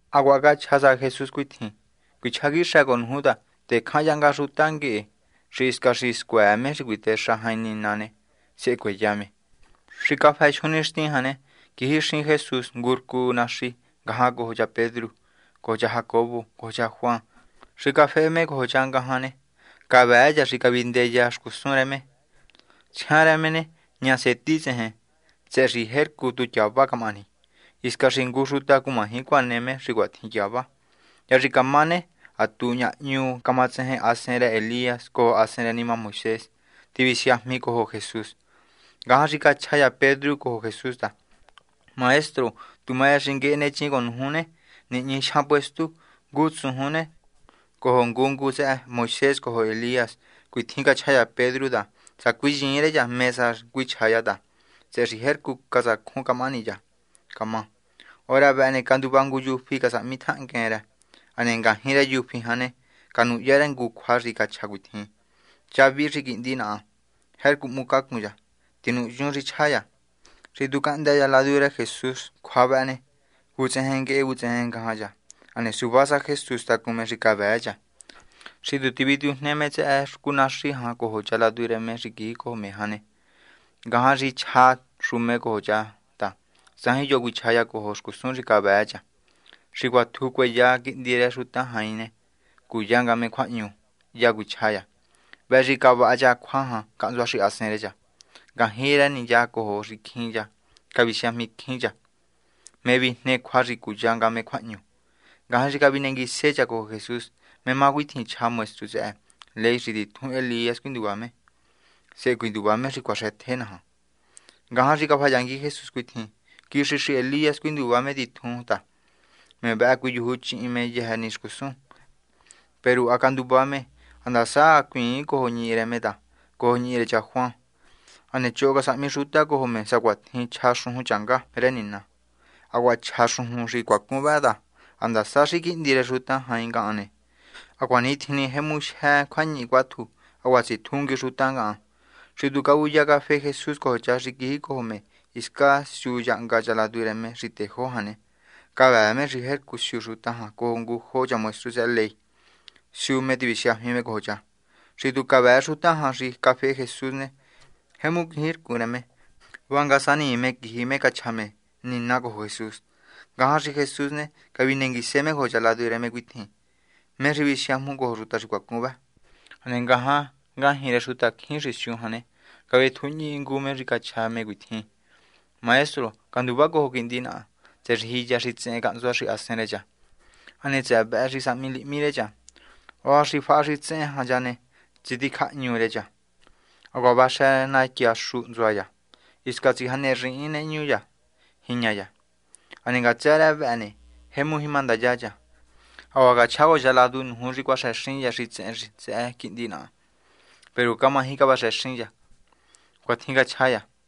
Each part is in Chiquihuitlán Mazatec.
Hacuaha cachja sa Jesús cuitjin: ―Cuichjá quixë cojo nuju ta tecjan yahnga xuta nguehe xi hisca xi scuëë me xi cuitexa jain Nina ne, sehe cueya me. Xi cafë jyun nixtin jan ne, quijixin Jesús ngu rcu naxi hnga cojo cha Pedru cojo cha Jacobo cojo cha Juan. Xi cafehe me cojo cha ngajan ne, cavëë cha xi cavindeya xcusun rë me. Tsjian rë me ne, ña seti tsejen, tsëhë xi jercu tu tyava camahani, hisca xi ngu xuta cumaji cuane me xi cuatjin tyava. Hya xi camá ne, ha tu ñahñu camatsejen hasen rë Elías cojo hasen rë nima Moisés, tivisiajmi cojo Jesús. Ngajan xi cachja cha Pedru cojo Jesús ta: ―Maestro, tu ma rë xi nguehe nechin cojo nuju ne, nihñi jyan puestu: ngu tsujun ne, cojo ngu ngu tsëhë Moisés cojo Elías. Cuatjin cachja cha Pedru ta, sacuinyiin rë cha mé sa cuichja cha ta tsëhë xi jercu catsacjun camahani cha camá. Hora vëhë ne, canduva ngu yufí casahmi tjahnguen rë. Hane ngajñi rë yufí jan ne, canuhya rë ngujo cjua xi cachja cuitjin: ―Cha vihi xi quihndi naha cha. Jercu hmucacun cha. Tinuhyun xi chja cha. Xi tu cahndë cha ladu rë Jesús cjua vëhë ne, vutsejen nguehe vutsejen ngajan cha, hane suva sa Jesús tacun me xi cavëë cha. Xi tu tivitujne me tsëhë rcu naxi jan cojo cha ladu rë me xi quijicojo me jan ne, ngajan xi chja xu me cojo cha ta tsajin yo xi cuichja cha cojo xcusun xi cavëë cha. Xi cuatju cueya Quihndi rë Xuta Jain ne, cuya nga me cjuahñu, sehe hya cuichja cha. Vëhë xi cavaha cha cjua jan cahntsua xahasen rë cha. Ngajñi rë ni cha cojo xicjin cha cavisiajmicjín cha ¿mé vijne cjua xi cuya nga me cjuahñu? Ngajan xi cavinenguise cha cojo Jesús cuitjin: ―¿Mé má cuatjin chja maestru tsëhë ley xi titjun Elías cuinduva me, sehe cuinduva me xi cuaxëtje naja? Ngajan xi cafayangui Jesús cuitjin: ―Quixi xi Elías cuinduva me titjun ta, me vëhë cuiyujuchihin me yëjë ni xcusun. Peru ha canduva me, handasa hacuiin cojo ñihi rë me ta cojo ñihi rë cha Juan. Hane choho casahmi xuta cojo me sacuatjin chja xujun rë Nina. Hacuaha chja xujun xi cuacun vëhë ta handasa xi Quihndi rë Xuta Jain ngahan ne, hacuanitjin ne jemu jyë cjuañihi cuátju hacuaha tsitjungui xuta ngahan. Xi tu cavuya cafehe Jesús cojo cha xi quijicojo me hiscan siu yahnga cha ladu rë me xi tejó jan ne, cavëë me xi tjercu siu xuta jan cojo ngujo cha maestru tsëhë ley siu me visiajmi me cojo cha. Xi tu cavëë xuta jan xi cafehe Jesús ne, jemu quijircun rë me, vanga sanii me quiji cachja me nina cojo Jesús. Ngajan xi Jesús ne, cavinenguise me cojo cha ladu rë me cuitjin: ―¿Mé xi visiajmu cojo xuta xi cuacun vë? Hane ngajan ngajñi rë xutacjín xi siu jan ne, cavetjujñi ngu me xi cachja me cuitjin: ―Maestro, canduvá cojo quihndi naha, tsëhë xi jiya xitsehen cahntsua xahasen rë cha. Hane tsëhë vëhë xi sahmi lihmi rë cha. Hora xi faha xitsehen jan cha ne, ngutjen tsiticjahñu rë cha, hacuaha vaxë natyaxu hntsua cha, hisca tsijanerii nehñu cha jiña cha. Hane ngatsë rë vëhë ne, jemu jima ndaya cha. Hacuaha cachjá cojo cha ladu nuju xi cuaxëxin cha xitsehen tsëhë quihndi naha. Peru camaji cavaxëxin cha. ―Cuatjin cachja me.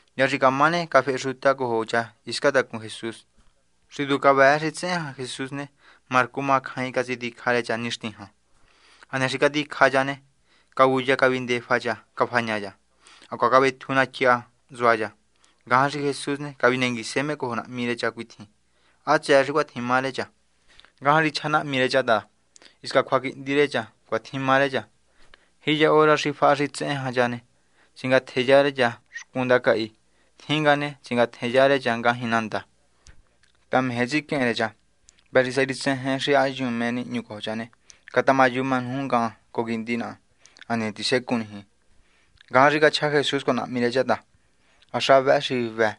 Hya xi camá ne, cafehe xuta cojo cha hiscan tacun Jesús. Xi tu cavëë xitsehen jan Jesús ne, marcu macjain catsiticja rë cha nixti jan. Hane xi caticja cha ne, cavuya cavindefa cha cafaña cha. Hacuaha cavetju natyaxu hntsua cha. Ngajan xi Jesús ne, cavinenguise me cojo nahmi rë cha cuitjin: ―¿Há tsëë xi cuitjin má rë cha? Ngajan xi chja nahmi rë cha ta: ―Hisca cjuaquihndi rë cha, cuatjin má rë cha. Jiya hora xi faha xitsehen jan cha ne, tsingatjeya rë cha xcun ndacahi. Tjin nga ne, tsingatjenya rë cha ngajñi nandan, ta meje tsiquehen rë cha. Vëhë xi sá xi tsejen xi ha hyun mé nihñu cojo cha ne, catamayuma nuju ngahan cojo quihndi naha, hane tisecun niji. Ngajan xi cachja Jesús cojo nahmi rë cha ta: ―Há xa vë xi hvë.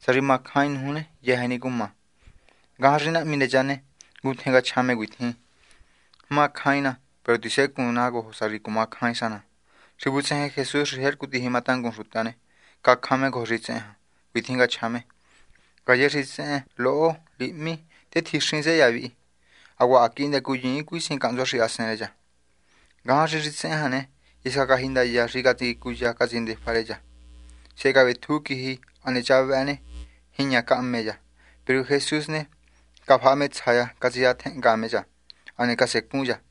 Sá xi macjain nuju ne, yëjë ni ne, cuma. Ngajan xi nahmi rë cha ne, ngutjen cachja me cuitjin: ―Tatá. Macjain ná. Peru tisecun ná cojo sa xi cumacjain sa ná. Xi vutsejen Jesús xi jercu tijima tangun xuta ne, cacjan me cojo xitsehen jan. Cuitjin cachja me: ―Ngaye xitsehen loho lihmi, tetjixin tsëhë cha vi. Hacuaha ha quihndë cuyiin cuisihin cahntsua xahasen rë cha. Ngajan xi xitsehen jan ne, hisca cajindaya xi catsicuya catsindefa rë cha. Sehe cavetju quiji. Hane cha vëhë ne, jiña cahme cha. Peru Jesús ne, cafaha me tsja cha catsisatjenhnga me cha, hane casecun cha.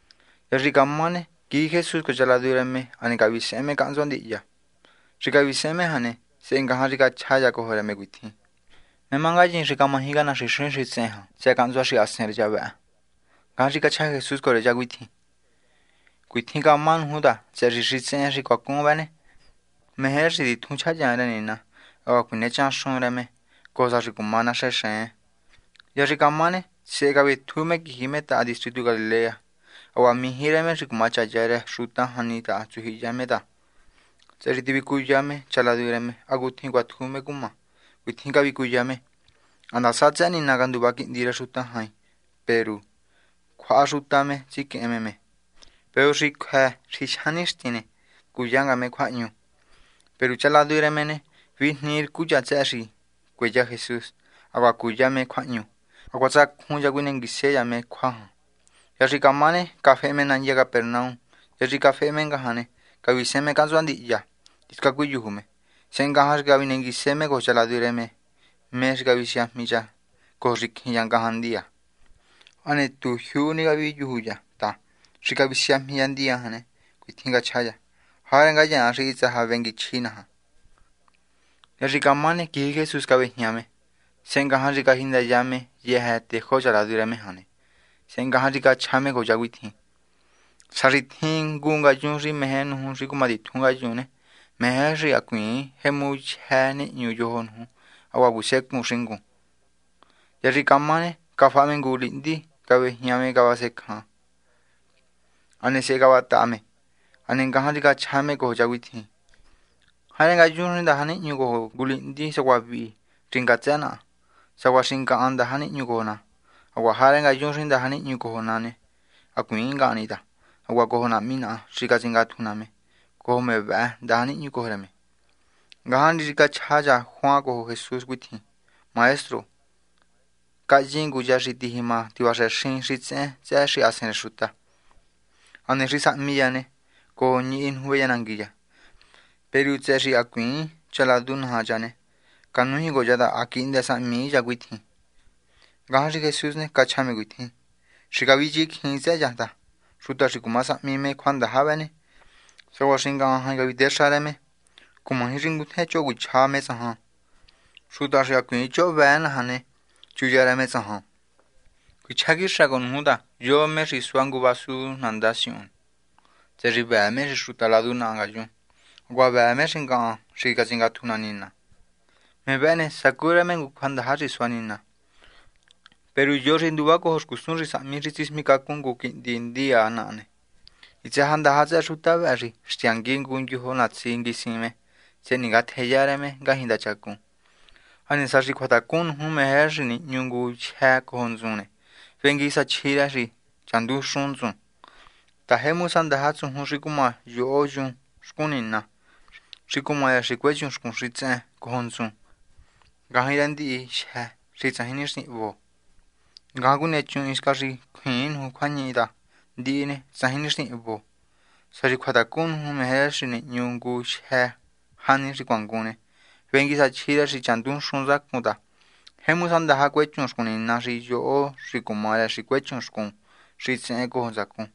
Hya xi camá ne, quiji Jesús cojo cha ladu rë me, hane cavisehen me cahntsua ndihya. Xi cavisehen me jan ne, sehe ngajan xi chja cha cojo rë me cuitjin: ―¿Mé má ngayin xi camaji canaxinxin xitsehen jan tsëhë cahntsua xahasen rë cha vë? Ngajan xi cachja Jesús cojo cha cuitjin: ―Cuatjin camá nuju ta tsëhë xi xitsehen xi cuacun vë ne, meje rë xi titjun chjahyan rë Nina hacuaha cuinechan xun rë me, cojo sa xi cuma naxenxen. Hya xi camá ne, sehe cavetju me quiji me taha distritu Galilea. Hacuaha mijí rë me xi cumachaya rë xuta jani taha tsujyihiya me ta, tsëhë xi tivicuya me cha ladu rë me hacutjin cuatju me cumá. Cuitjin cavicuya me: ―Ha ndasa tsëhë Nina canduva Quihndi rë Xuta Jain ne, peru cjuaha xuta me ne, tsiquehen me me. Peru xi cjuë xi jyan nixtin ne, cuya nga me cjuahñu. Peru cha ladu rë me ne, vijnii rcu cha tsëhë xi cueya Jesús, hacuaha cuya me cjuahñu. Hacuaha tsacjun cha cuinenguise cha me cjua jan. Hya xi camá ne, cafehe me nandya Capernaum. Hya xi cafehe me jan ne, cavisehen me cahntsua ndihya hisca cuiyuju me. Sehe ngajan xi cavinenguise me cojo cha ladu rë me mé xi cavisiajmi cha cojo xicjin cha ngajan ndiya. Hane tu jyuu ni caviyuju cha ta xi cavisiajmi cha ndiya jan ne, cuitjin cachja cha: ―¿Jarë ngayaan xi hitsë sa venguichji naja? Hya xi camá ne, quiji Jesús cavéjña me. Sehe ngajan xi cajindaya me yëjë tejó cha ladu rë me jan ne, sehe ngajan xi cachja me cojo cha cuitjin: ―Sá xi tjin ngu yun xi meje nuju xi cumatitjun ngayun ne, meje rë xi hacuiin jemu jyë nihñu yojo nuju hacuaha cuisecun xingun. Hya xi camá ne, cafaha me ngu lihndi, cavejña me cavasencja, hane sehe cavataha me. Hane ngajan xi cachja me cojo cha cuitjin: ―Jarë ngayun xi ndaja nihñu cojo ngu lihndi sacuaha vihi xi ngatsë naha ne, sacuaha xi ngahan ndaja nihñu cojo ná. Hacuaha jarë ngayun xi ndaja nihñu cojo ná ne, hacuiin ngahan ni ta, hacuaha cojo Nahmi naha xi catsingatju ná me, cojo me vëhë ndaja nihñu cojo rë me. Ngajan xi cachja cha Juan cojo Jesús cuitjin: ―Maestro, cahyin ngu cha xi tijima tivaxëxin xitsehen tsëhë xahasen rë xuta, hane xi sahmi cha ne, cojo ñihi nuju veyanangui cha. Peru tsëhë xi hacuiin cha ladu naja cha ne, canújin cojo cha ta ha quihndë sahmii cha cuitjin. Ngajan xi Jesús ne, cachja me cuitjin: ―Xi cavichecjiin tsëhë cha ta xuta xi cuma sahmi me cjuandaja vëhë, sacuaha xi ngahan jain cavitéxa rë me ne, cumaji xi ngutjen choho cuichja me tsahan. Xuta xi hacuiin choho vëë naja me ne, chuya rë me tsajan. Cuichjá quixë cojo nuju ta yo me xi sua ngu vasu nandá siuhun, tsëhë xi vëë me xi xuta ladu naha ngayun, hacuaha vëë me xi ngahan xi catsingatju ná Nina ne, me vëhë ne, sacu rë me ngu cjuandaja xi sua Nina. ’Peru yo xi nduvacojo xcusun xi sahmi xi tsismicacun ngu quihndi ndiya naha ne, hitsë sa ndaja tsëhë xuta vëhë xi xtyangui ngu ndyojo natsi nguisin me sehe ningatjeya rë me ngajñi ndachacun. Hane sá xi cjuatacun nuju meje rë xi nihñu ngu jyë́ cojo ntsun ne, vengui sa chji rë xi chandunxun ntsun ta, jemu sa ndaja tsujun xi cuma yoho yun xcun Nina, xi cumá rë xi cuechun xcun xitsehen cojo ntsun ngajñi rë ndihi jyë xi tsajin nixtin hvo. Ngajan cuinechun, hiscan xi cjuiin nuju cjuañihi ta ndihi ne, tsajin nixtin xi hvo. Sá xi cjuatacun nuju meje rë xi nihñu ngu jyë́ jani xi cuangun ne, vengui sa chji rë xi chandunxun ntsacun ta, jemu sa ndaja cuechun xcun Nina xi yoho yun xi cuma rë xi cuechun xcun xitsehen cojo ntsacun.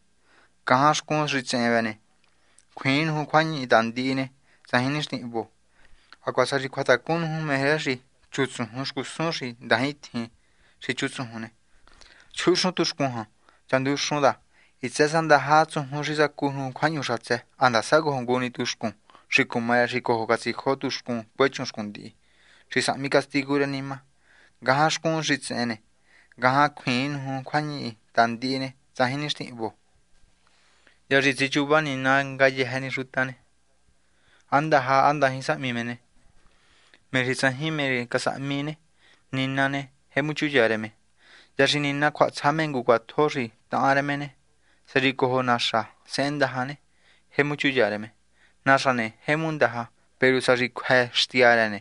Ngajan xcun xitsehen vëhë ne, cjuiin nuju cjuañihi ta ndihi ne, tsajin nixtin hvo. Hacuaha sá xi cjuatacun nuju meje rë xi chutsujun xcusun xi ndajintjin xi chutsujun ne, chuhunxun tuxcun jan chandunxun, ta tsëhë xi hitsë sa ndaja tsujun xi sacu nuju cahndë́ ngajan hiscan sahmi Nina gubiernu handasa cojo ngu ni tuxcun xi cuma rë xi cojo catsijo tuxcun cuechun xcun ndihi xi sahmi castigu rë nima. Ngajan xcun xitsehen ne, ngajan cjuiin nuju cjuañihi ta ndihi ne, tsajin nixtin hvo. ’Hya xi tsichuva Nina ngayëjë ni xuta há ndaja há ndajin casahmi me ne, me xi tsajin mé casahmi ne, Nina ne, jemu chuya rë me. Hya xi Nina cjuahatsja me ngu cjuatjo xi tahan rë me ne, sá xi cojo naxa sehen ndaja ne, jemu chuya rë me. ’Naxa ne, jemu ndaja. Peru sá xi cjuë xtya rë ne,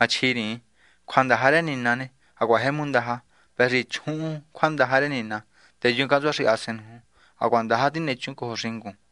machjiriin. Cjuandaja rë Nina ne, hacuaha jemu ndaja. Vëhë xi chjuhun cjuandaja rë Nina, teyun cahntsua xahasen nuju, hacuaha ndaja tinechun cojo xingun.